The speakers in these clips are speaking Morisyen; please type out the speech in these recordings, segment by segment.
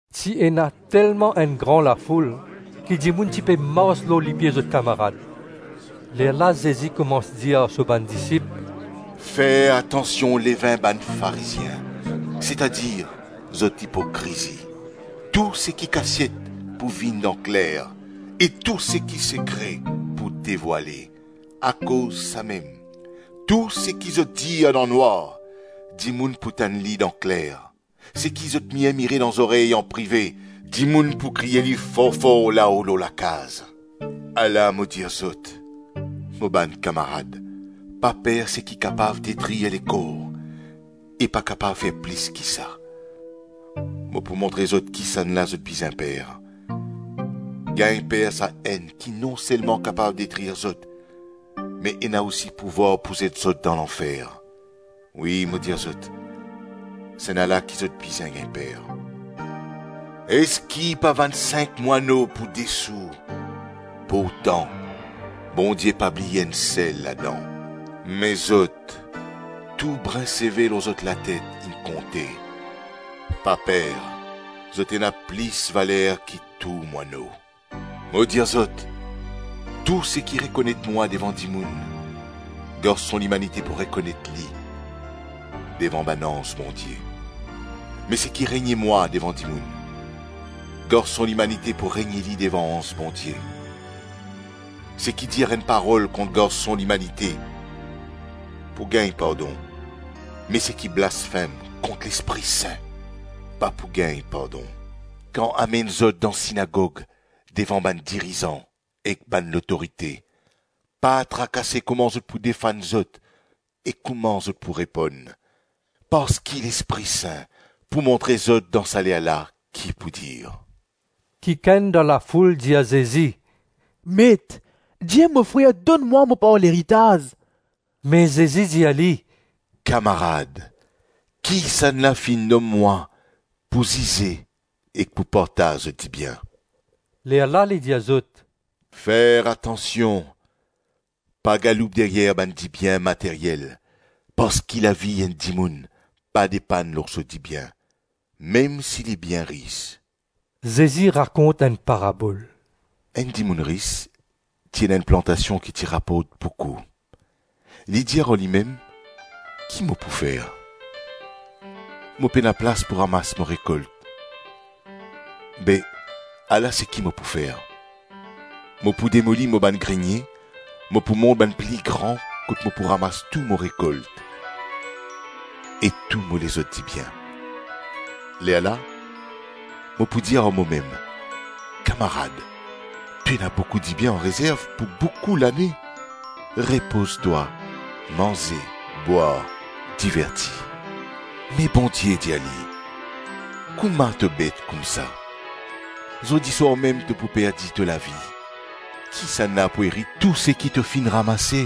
Ti ena telman enn gran lafoul ki dimoun ti pe mars lor lipie zot kamarad. Lerla Zezi koumans dir ar so bann disip, “Fer atansion levin bann Farizien, setadir, zot ipokrizi. Tou seki kasiet pou vinn dan kler e tou seki sekre pou devwale. Akoz samem tou seki zot dir dan nwar, dimoun pou tann li dan kler, seki zot mirmire dan zorey anprive, dimoun pou kriye li for-for lao lor lakaz. Ala mo dir zot, mo bann kamarad, pa per seki kapav detrir lekor, e pa kapav fer plis ki sa. Mo pou montre zot kisannla zot bizin per: gagn per Sa-Enn ki non selman kapav detrir zot me ena osi pouvwar pou zet zot dan lanfer. Wi, mo dir zot, Sennala ki zot bizin gagn per. Eski pa vann sink mwano pou de sou? Pourtan, Bondie pa bliye enn sel ladan. Me zot, tou brin seve lor zot latet inn konte. Pa per, zot ena plis valer ki tou mwano. Mo dir zot, tou seki rekonet mwa devan dimoun, Garson Limanite pou rekonet li devan bann anz Bondie. Me seki renie mwa devan dimoun, Garson Limanite pou renie li devan anz Bondie. Seki dir enn parol kont Garson Limanite pou gagn pardon; me seki blasfem kont Lespri Sin, pa pou gagn pardon. Kan amenn zot dan sinagog devan bann dirizan ek bann lotorite, pa trakase kouma zot pou defann zot e kouma zot pou reponn, parski Lespri Sin pou montre zot dan sa ler la ki pou dir. Kikenn dan lafoul dir Zezi, “Met, dir mo frer donn mwa mo par leritaz.” Me Zezi dir li, “Kamarad, kisannla finn nom mwa pou zize ek pou partaz zot dibien?” Lerla li dir zot, “Fer atansion! Pa galoup deryer bann dibien materyel, parski lavi enn dimoun pa depann lor so dibien, mem si li bien ris.” Zezi rakont enn parabol. “Enn dimoun ris ti ena enn plantasion ki ti raport boukou. Li dir ar limem, ‘Ki mo pou fer? Mo pena plas pou ramas mo rekolt. Be, ala seki mo pou fer: mo pou demoli mo bann grenie, mo pou mont bann pli gran kot mo pou ramas tou mo rekolt e tou mo lezot dibien. Lerla mo pou dir ar momem, Kamarad, to ena boukou dibien anrezerv pou boukou lane; repoz twa, manze, bwar, diverti.’ Me Bondie dir li, ‘Kouma to bet koumsa! Zordi swar mem to pou perdi to lavi; kisannla pou erit tou seki to finn ramase?’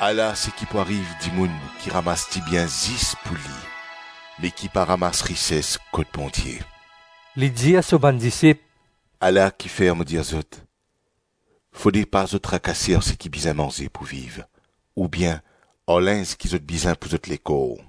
Ala seki pou ariv dimoun ki ramas dibien zis pou li, me ki pa ramas rises kot Bondie.” Li dir so bann disip, “Ala kifer mo dir zot, fode pa zot trakase ar seki bizin manze pou viv, oubien ar linz ki zot bizin pou zot lekor.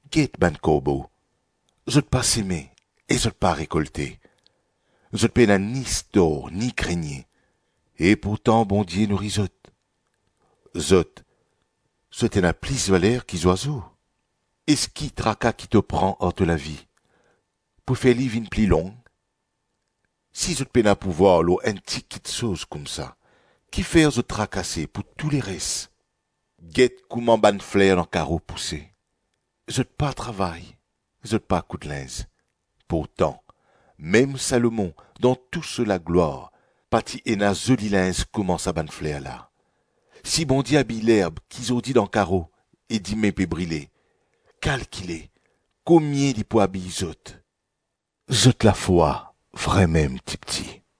Get bann korbo, zot pa seme e zot pa rekolte; zot pena ni stor ni grenie, e pourtan Bondie nouri zot. Zot, zot ena plis valer ki zwazo! Eski traka ki to pran ar to lavi, pou fer li vinn pli long? Si zot pena pouvwar lor enn ti kiksoz koumsa, kifer zot trakase pou tou leres? Get kouma bann fler dan karo pouse; zot pa travay, zot pa koud linz. Pourtan, mem Salomon dan tou so laglwar pa ti ena zoli linz kouma sa bann fler la. Si Bondie abiy lerb ki zordi dan karo ek dime pe brile, kalkile komie li pou abiy zot. Zot lafwa vremem tipti.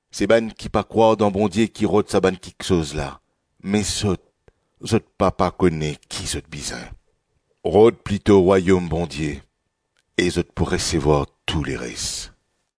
Se bann ki pa krwar dan Bondie ki rod sa bann kiksoz la; me zot, zot Papa kone ki zot bizin. Rod plito Rwayom Bondie, e zot pou resevwar tou leres.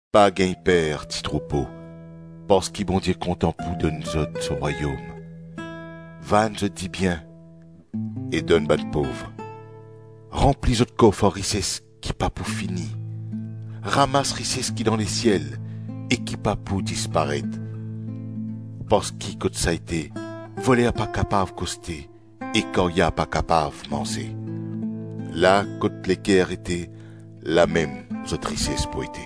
Pa gagn per, ti troupo, parski Bondie kontan pou donn zot so Rwayom. Vann zot dibien e donn bann pov; ranpli zot kof ar rises ki pa pou fini; ramas rises ki dan lesiel e ki pa pou disparet; parski kot sa ete, voler pa kapav koste e karya pa kapav manze. La kot leker ete, lamem zot rises pou ete.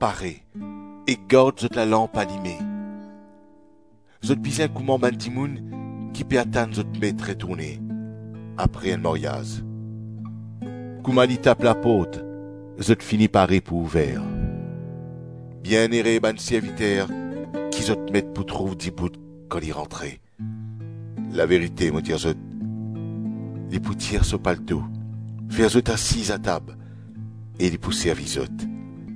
Pare e gard zot lalanp alime. Zot bizin kouma bann dimoun ki pe atann zot met retourne apre enn maryaz; kouma li tap laport, zot fini pare pou ouver. Bienere bann serviter ki zot met pou trouv dibout kan li rantre. Laverite mo dir zot, li pou tir so palto, fer zot asiz atab, e li pou servi zot.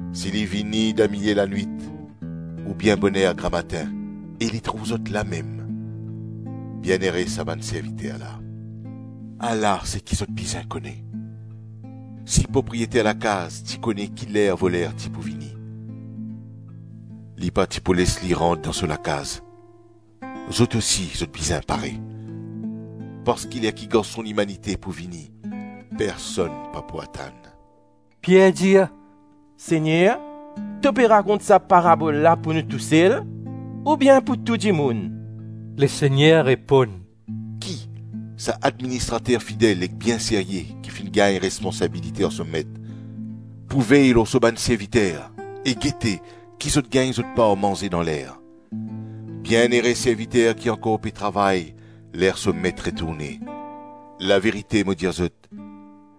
Si li vini damilie lanwit, oubien boner gramatin e li trouv zot lamem, bienere sa bann serviter la! Ala seki zot bizin kone: si propriyeter lakaz ti kone ki ler voler ti pou vini, li pa ti pou les li rant dan so lakaz. Zot osi zot bizin pare, parski ler ki Garson Limanite pou vini personn pa pou atann.” Pier dir, “Segner, to pe rakont sa parabol la pou nou tousel oubien pou tou dimoun?” Lesegner reponn, “Ki sa administrater fidel ek bien serye ki finn gagn responsabilite ar so met pou vey lor so bann serviter e gete si zot gagn zot par manze dan ler? Bienere serviter ki ankor pe travay ler so met retourne. Laverite mo dir zot,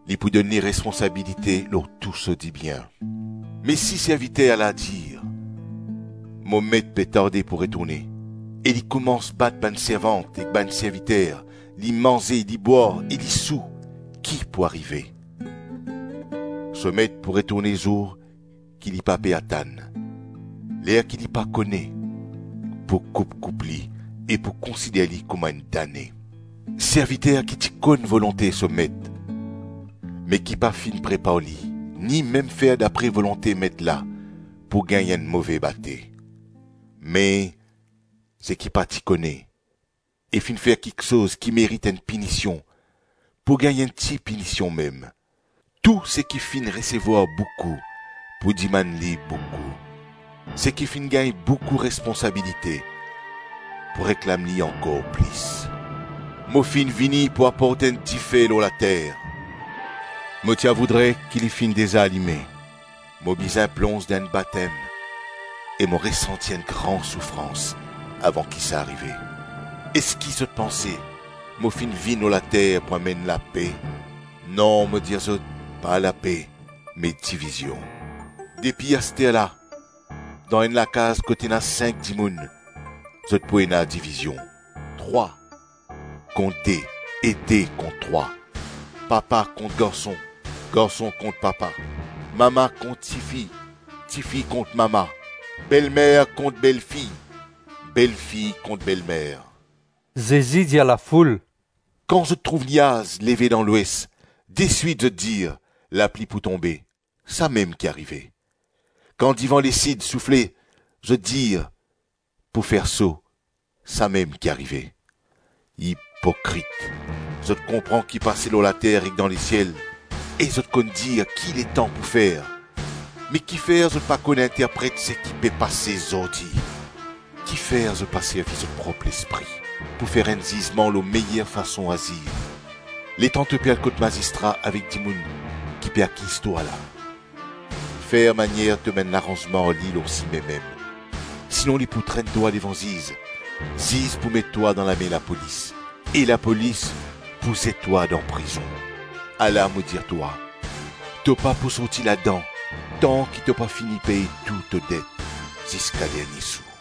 li pou donn li responsabilite lor tou so dibien. Me si serviter la dir, ‘Mo met pe tarde pou retourne,’ e li koumans bat bann servant ek bann serviter, li manze, li bwar e li sou, ki pou arive! So met pou retourne zour ki li pa pe atann, ler ki li pa kone, pou koup-koup li e pou konsider li kouma enn dane. Serviter ki ti konn volonte so met, me ki pa finn prepar li, ni mem fer dapre volonte met la, pou gagn enn move bate. Me, seki pa ti kone, e finn fer kiksoz ki merit enn pinision, pou gagn enn ti pinision mem. Tou seki finn resevwar boukou, pou dimann li boukou; seki finn gagn boukou responsabilite, pou reklam li ankor plis. Mo finn vini pou aport enn dife lor later; mo ti a voudre ki li finn deza alime. Mo bizin plonz dan enn batem e mo resanti enn gran soufrans avan ki sa arive. Eski zot panse mo finn vinn lor later pou amenn lape? Non, mo dir zot; pa lape, me divizion. Depi asterla, dan enn lakaz kot ena sink dimoun zot pou ena divizion, trwa kont de e de kont trwa, papa kont garson, garson kont papa; mama kont tifi, tifi kont mama; belmer kont belfi, belfi kont belmer. Zezi dir lafoul, “Kan zot trouv niaz leve dan lwes, deswit zot dir, ‘Lapli pou tonbe’; samem ki arive. Kan divan lesid soufle zot dir, ‘Pou fer so,’ samem ki arive. Ipokrit! Zot konpran ki pase lor later ek dan lesiel e zot konn dir ki letan pou fer me kifer zot pa konn interpret seki pe pase zordi? Kifer zot pa servi zot prop lespri pou fer enn zizman lor meyer fason azir? Letan to pe al kot mazistra avek dimoun ki pe akiz twa la, fer manier tom enn laranzman ar li lor sime mem; sinon li pou trenn twa devan ziz, ziz pou met twa dan lame lapolis, e lapolis pou zet twa dan prizon. Ala mo dir twa, to pa pou sorti ladan tanki to pa fini pey tou to det ziska dernie sou.